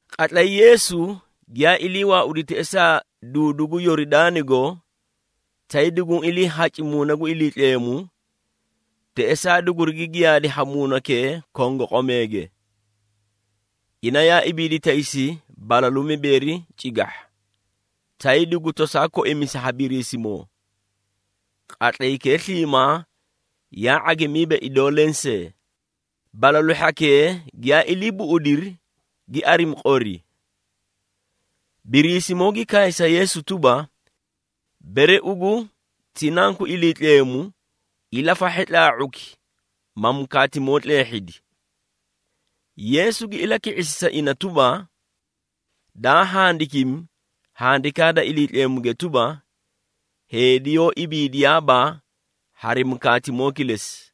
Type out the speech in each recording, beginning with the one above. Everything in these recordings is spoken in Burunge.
Qatlay Yeesu giyaa ilii waaudi teꞌesaa duudu gu Yoridaanigo, tay duguũ iliihaci Muuna gu Iliitleemu, teꞌesaa dugurigi giyaadi ha Muunakee kongoqomeege. Ina yaa ibiidi taysi balalu mibeeri cigahha, tay dugu tosaa koimisi ha Biriisimoo. Qatlaykee sliimaa yaa ⁄agimiiba idoo lensee. Balalu hhakee giyaa ilii buꞌudiri, gi arimi qori. Biriisimoo gi kaay sa Yeesu tuba, “Bere ugu ti Nanku Iliitleemu, ilafahhe tlaa⁄uki, ma mukaatimoo tleehhidi.” Yeesu gi ilaki⁄isi sa ina tuba, “Daa handikimi, Handikaa da Iliitleemuge tuba, ‘Heedi yoó ibiidiyaaba hari ⁄agoo kilesi.’”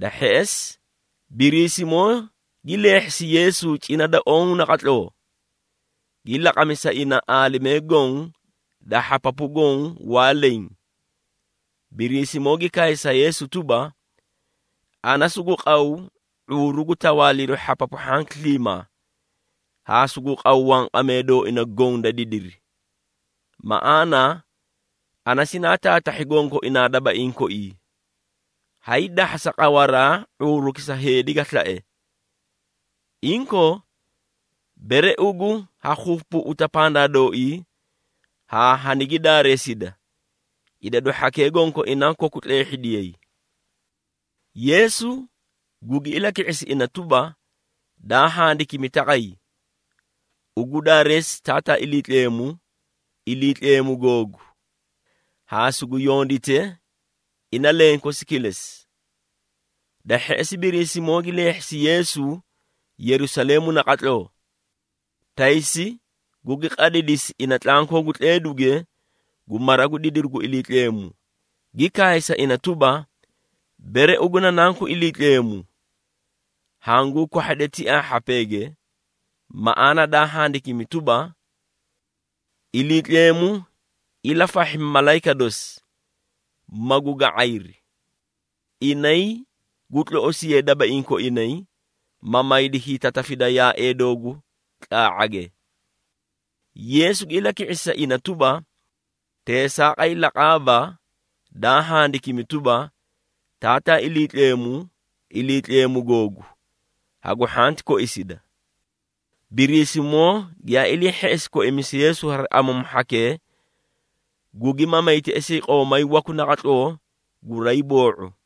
Da hheꞌesi Biriisimoo gi leehhisi Yeesu cina da oõ naqatloo, gi laqami sa ina aalimee goõ da hhapapu goõ waa leẽ. Biriisimoo gi kaay sa Yeesu tuba, “Ana sugu qaw ⁄uuru gu tawaaliru hhapapu hhanki sliimaa, haa sugu qaw wanqamee dooina goõ da didiri. Maꞌaana ana sinaa taatahhi gonkoinaa dabaiĩ koi, haydahhasa qawaraa ⁄uuruki sa heedi ga slae. Inkoo, bere ugu ha keebeeꞌeta pandaa dooii haa hanigi daareesida, idadu hhakee gonkoinaa koku tleehhidiyay.” Yeesu gugi ilaki⁄isi ina tuba, “Daa handikimi taqay, ‘Ugu daareesi Taataa Iliitleemu, Iliitleemu googu, haa sugu yondite ina lenkosi kilesi.’” Da hheꞌesi Biriisimoo gi leehhisi Yeesu Yerusaleemu naqatloo. Taysi gugi qadidisi ina tlankoo gu tleeduge gu mara gu didiru gu Iliitleemu, gi kaay sa ina tuba, “Bere ugu na Nanku Iliitleemu, hanguu kwahhade tiaa hhapeege. Maꞌaana daa handikimi tuba, ‘Iliitleemu ilafahhi malayika dosi, magu ga⁄ayri. Inay gu tloꞌosiyay dabaiĩ koinay, ma maydi hiitatafida yaaee doogu tlaa⁄age.’” Yeesu gi ilaki⁄isi sa ina tuba, “Teesaaqay laqaaba, daa handikimi tuba, ‘Taataa Iliitleemu, Iliitleemu googu, hagu hhanti koisida.’” Biriisimoo giyaa ilii hheꞌesi koimisu Yeesu hari amamu hhakee, gugi mamay teꞌesii qoomay waku naqatloo guraay boo⁄u.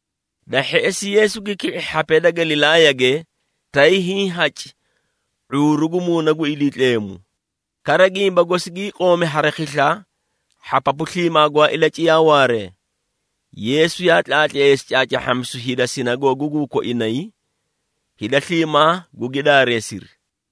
Da hheꞌesi Yeesu gi ki⁄i hhapee da Galilaayage, tay hiĩ haci ⁄uuru gu Muuna gu Iliitleemu. Kara gimba gosi gii qoomi hari khisla hhapapu sliimaa gwaa ilaciyaa waaree. Yeesu yaa tlaatleesi caacaahhamisu hida sinagoogaguu koinay, hida sliimaa gugi daareesiri.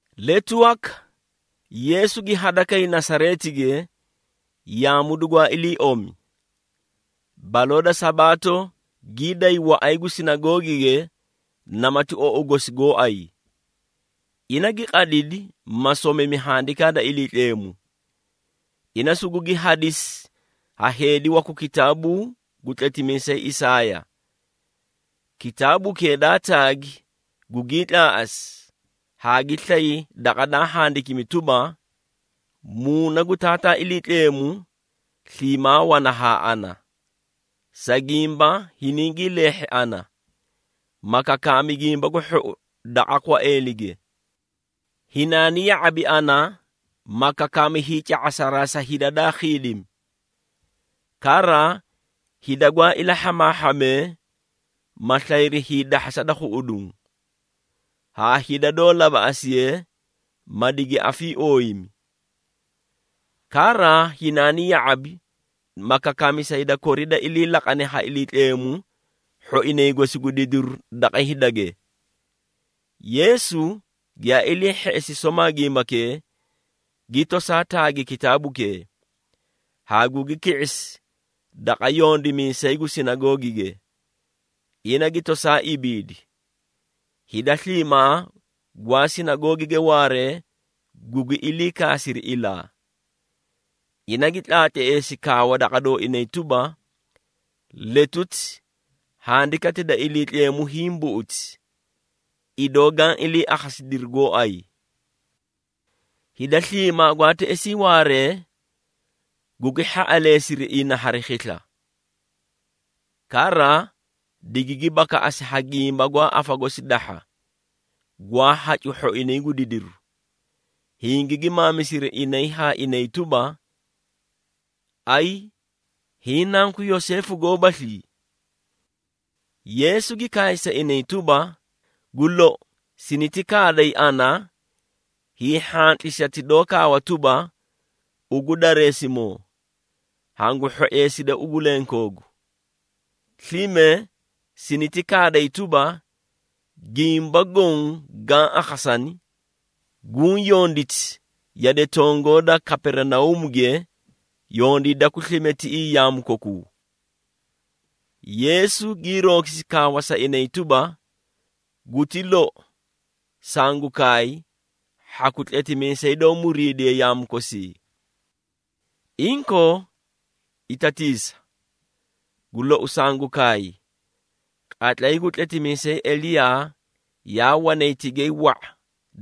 Letu waka Yeesu gi hadakay Nasareetige, yaamu dugwaa ilii omi. Baloo da Sabaato gii day waꞌay gu sinagoogige namati ou gosi gooay. Ina gi qadidi, ma somimi Handikaa da Iliitleemu. Ina sugugi hadisi ha heedi waku kitaabuu gu tletimiisay Isaaya. Kitaabukee daa taagi gugii tlaaꞌasi haa gi slay daqa daa handikimi tuba, “Muuna gu Taataa Iliitleemu, sliimaa wana haa ana, sa gimba hiningii leehhi ana, ma kakaami Gimba gu Hhou daqa kwaeelige. Hinaani ya⁄abi ana, ma kakaami hiica⁄asaraa sa hida daa khiidimi, kara hida gwaa ilahhamaahhamee, ma slayri hiidahhasa da khuꞌuduũ, haa hida doó labaꞌasiye, ma digi afiiooyimi. Kara hinaani ya⁄abi, ma kakaami sa hida kori da ilii laqane ha Iliitleemu hhoinay gosi gu didiru daqa hidage.” Yeesu giyaa ilii hheꞌesi somaa gimbakee, gi tosaa taagi kitaabukee, haa gugi ki⁄isi daqa yondimiisay gu sinagoogige, ina gi tosaa ibiidi. Hida sliimaa gwaa sinagoogige waaree gugi ilii kaasiri ilaa. Ina gi tlaatleesi kaawa daqa dooinay tuba, “Letuti Handikati da Iliitleemu hiĩ buꞌuti, idoo gaã ilii akhasidiri gooay.” Hida sliimaa gwaa teꞌesii waaree, gugi hhaꞌaleesiri ina hari khisla. Kara digigi bakaꞌasi ha gimba gwaa afa gosi dahha, gwaa hacu hhoinay gu didiru. Hingigi maamisiri inay haa inay tuba, “Ayi! Hiĩ nanku Yoseefu goobaslii?” Yeesu gi kaay sa inay tuba, “Gu lou, siniti kaaday ana hiihhantlisati doó kaawa tuba, ‘Ugu dareesimoo, hangu hhoeeside ugu lenkoogu!’ Slime siniti kaaday tuba, ‘Gimba goõ gaã akhasani, guũ yonditi yade tongoo da Kaperinauumuge, yondiidaku slime tiꞌii yaamu kokuu!’” Yeesu gii roogisi kaawa sa inay tuba, “Guti lou, sangu kaay, hhaku tletimiisay doó muriidiye yaamu kosii. Inkoo, itatiisa! Gu lou sangu kaay, qatlay gu tletimiisay Eliyaa yaa wanay tigay wa⁄a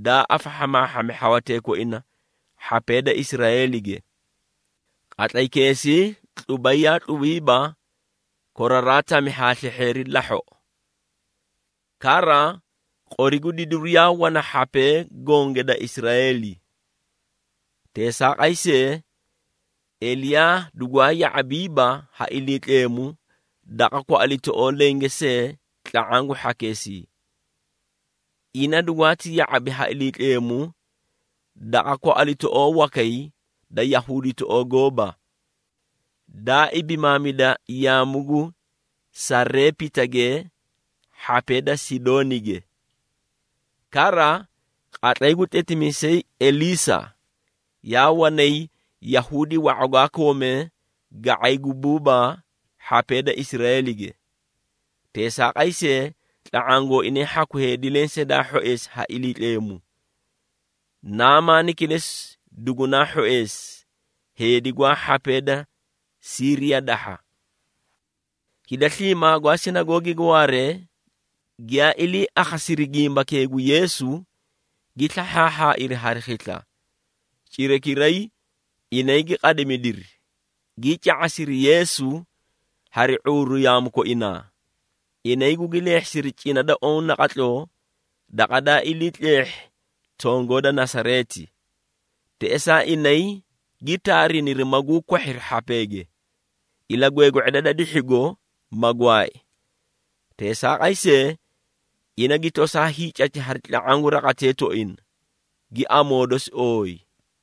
daa afahhamaahhami hhawatee koina hhapee da Israeelige. Qatlaykeesii tlubay yaa tlubiiba koraraa tami haa slehheeri lahhoꞌo. Kara qori gu didiru yaa wana hhapee gonge da Israeeli. Teesaaqay see, Eliyaa dugwaa ya⁄abiiba haa Iliitleemu daqa kwaꞌalitoꞌoo lenge see tla⁄aã gu hhakeesii. Ina dugwaati ya⁄abi ha Iliitleemu daqa kwaꞌalitoꞌoo wakay daa Yahuuditoꞌoo gooba, daa ibimaamida yaamu gu Sareepitage hhapee da Sidoonige. Kara, qatlay gu tletimiisay Elisaa, yaa wanay Yahuudi wa⁄a gwaa koomee ga⁄ay gu buubaa hhapee da Israeelige. Teesaaqay see, tla⁄aã gooinay hhaku lensee daa hhoeesi ha Iliitleemu. Namaani kilesi dugunaa hhoeesi, heedi gwaa hhapee da Siiriya dahha!” Hida sliimaa gwaa sinagoogige waaree, giyaa ilii akhasiri gimbakee gu Yeesu, gi slahhaahhaairi hari khisla. Cirakiray, inay gi qadimidiri, gii ca⁄asiri Yeesu hari ⁄uuru yaamu koinaa. Inay gugi leehhisiri cina da oõ naqatloo, daqa daa ilii tleehhi tongoo da Nasareeti. Teꞌesaa inay gi taariniri maguu kwahhiri hhapeege, ilagweegwe⁄eda da dihhigo, ma gwaai. Teesaaqay see, ina gi tosaa hiicati hari tla⁄aã gu raqatee tooina, gi amoo dosi ooyi.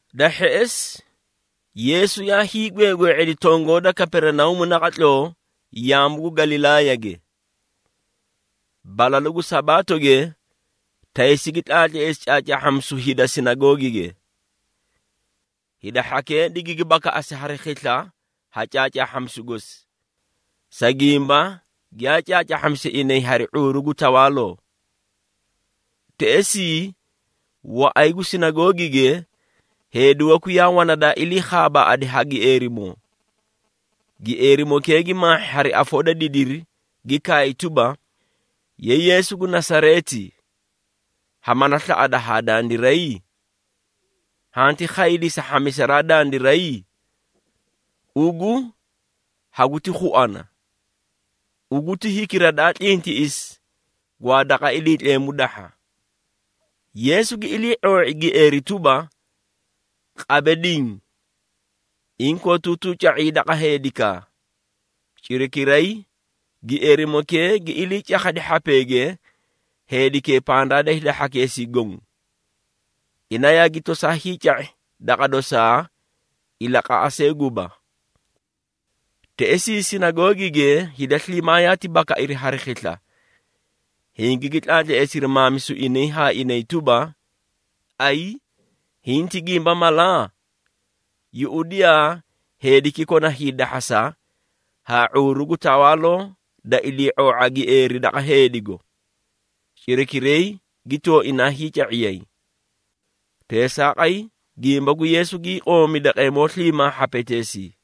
Da hheꞌesi Yeesu yaa hiigweegwe⁄edi tongoo da Kaperinauumu naqatloo yaamu gu Galilaayage. Balalu gu Sabaatoge, taysi gi tlaatleesi caacaahhamisu hida sinagoogige. Hida hhakee digigi bakaꞌasi hari khisla ha caacaahhamisu gosi, sa gimba giyaa caacaahhamisi inay hari ⁄uuru gu tawaaloo. Teꞌesii, waꞌay gu sinagoogige heedi waku yaa wana daa ilii khaabaaꞌadi ha gieerimoo. Gieerimokee gi maahhi hari afoo da didiri, gi kaay tuba, “Ye Yeesu gu Nasareeti, ha mala slaꞌada haa dandiray? Hanti khaydii sa hhamisaraa dandiray? Ugu, haguti khuana! Ugu ti hikira daa tlintiꞌisi gwaa daqa Iliitleemu dahha!” Yeesu gi ilii⁄oo⁄i gieeri tuba, “Qabe diĩ! Inkootuutuu ca⁄ii daqa heedikaa!” Cirakiray, gieerimokee gi ilii cakhadiri hhapeege heedikee pandaa da hida hhakeesii goõ. Ina yaagi toosaa hiica⁄i daqa dosaa ilaqaꞌa see guba. Teꞌesii sinagoogige hida sliimaa yaati bakairi hari khisla, hingigi tlaatleesiri maamisu inay haa inay tuba, “Ayi! Hiĩ ti gimba mala? Yuꞌudiyaa heediki kona hiidahhasa haa ⁄uuru gu tawaaloo da ilii⁄oo⁄a gieeri daqa heedigo, cirakiray gi tooinaa hiica⁄iyay.” Teesaaqay, gimba gu Yeesu gii qoomi daqeemoo sliimaa hhapeteesii.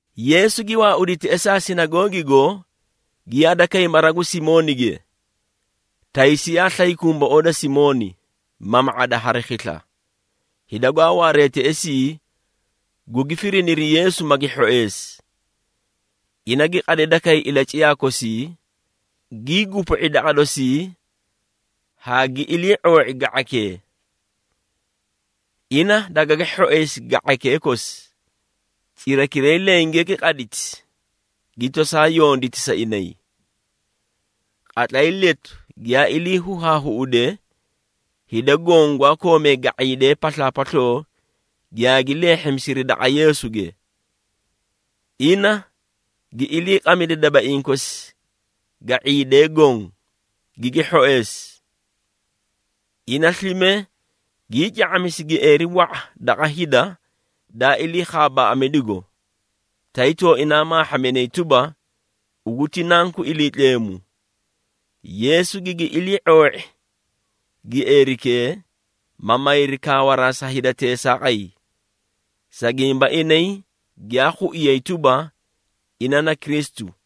Yeesu gi waaudi teꞌesaa sinagoogigo, gi hadakay mara gu Simoonige. Taysi yaa slay kumboꞌoo da Simooni, mama⁄ada hari khisla. Hida gwaa waaree teꞌesii gugi firiniri Yeesu, magi hhoeesi. Ina gi qadida kay ilaciyaa kosii, gii gupu⁄i daqa dosii haa gi ilii⁄oo⁄i ga⁄aykee. Ina dagagi hhoeesi ga⁄aykee kosi. Cirakiray lenge gi qaditi, gi tosaa yonditi sa inay. Qatlay letu giyaa ilii huhaahuꞌude, hida goõ gwaa koomee ga⁄iidee paslaapasloo giyaagi leehhimisiri daqa Yeesuge. Ina gi iliiqamidi dabaiĩ kosi ga⁄iidee goõ, gigi hhoeesi. Ina slime, gii ca⁄amisi gieeri wa⁄a daqa hida daa ilii khaabaaꞌamidigo, tay tooinaa maahhaminay tuba, “Ugu ti Nanku Iliitleemu!” Yeesu gigi ilii⁄oo⁄i gieerikee, ma mayri kaawaraa sa hida teesaaqay, sa gimba inay giyaa khuiyay tuba, ina na Kristu.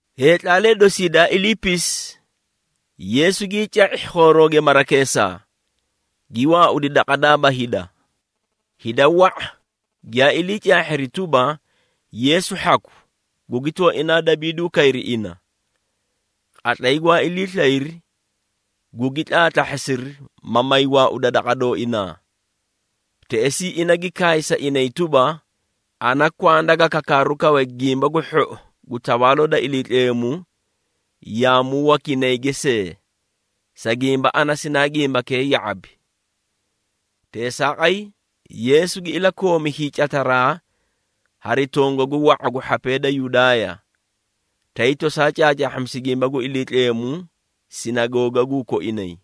Heetlaalee dosii daa iliipisi, Yeesu gii ca⁄i khoorooge marakeesaa, gi waaudi daqa daba hida. Hida wa⁄a giyaa ilii caahhiri tuba, Yeesu hhaku, gugi tooinaa dabiiduu kayri ina. Qatlay gwaa ilii slayri, gugi tlaatlahhasiri, ma may waauda daqa dooinaa. Teꞌesii ina gi kaay sa inay tuba, “Ana kwanda ga kakaaru kawe Gimba gu Hhou gu Tawaaloo da Iliitleemu yaamu wakinayge see, sa gimba ana sinaa gimbakee ya⁄abi.” Teesaaqay, Yeesu gi ilakoomi hiicataraa hari tongagu wa⁄a gu hhapee da Yudaaya, tay tosaa caacaahhamisi gimba gu Iliitleemu sinagoogaguu koinay.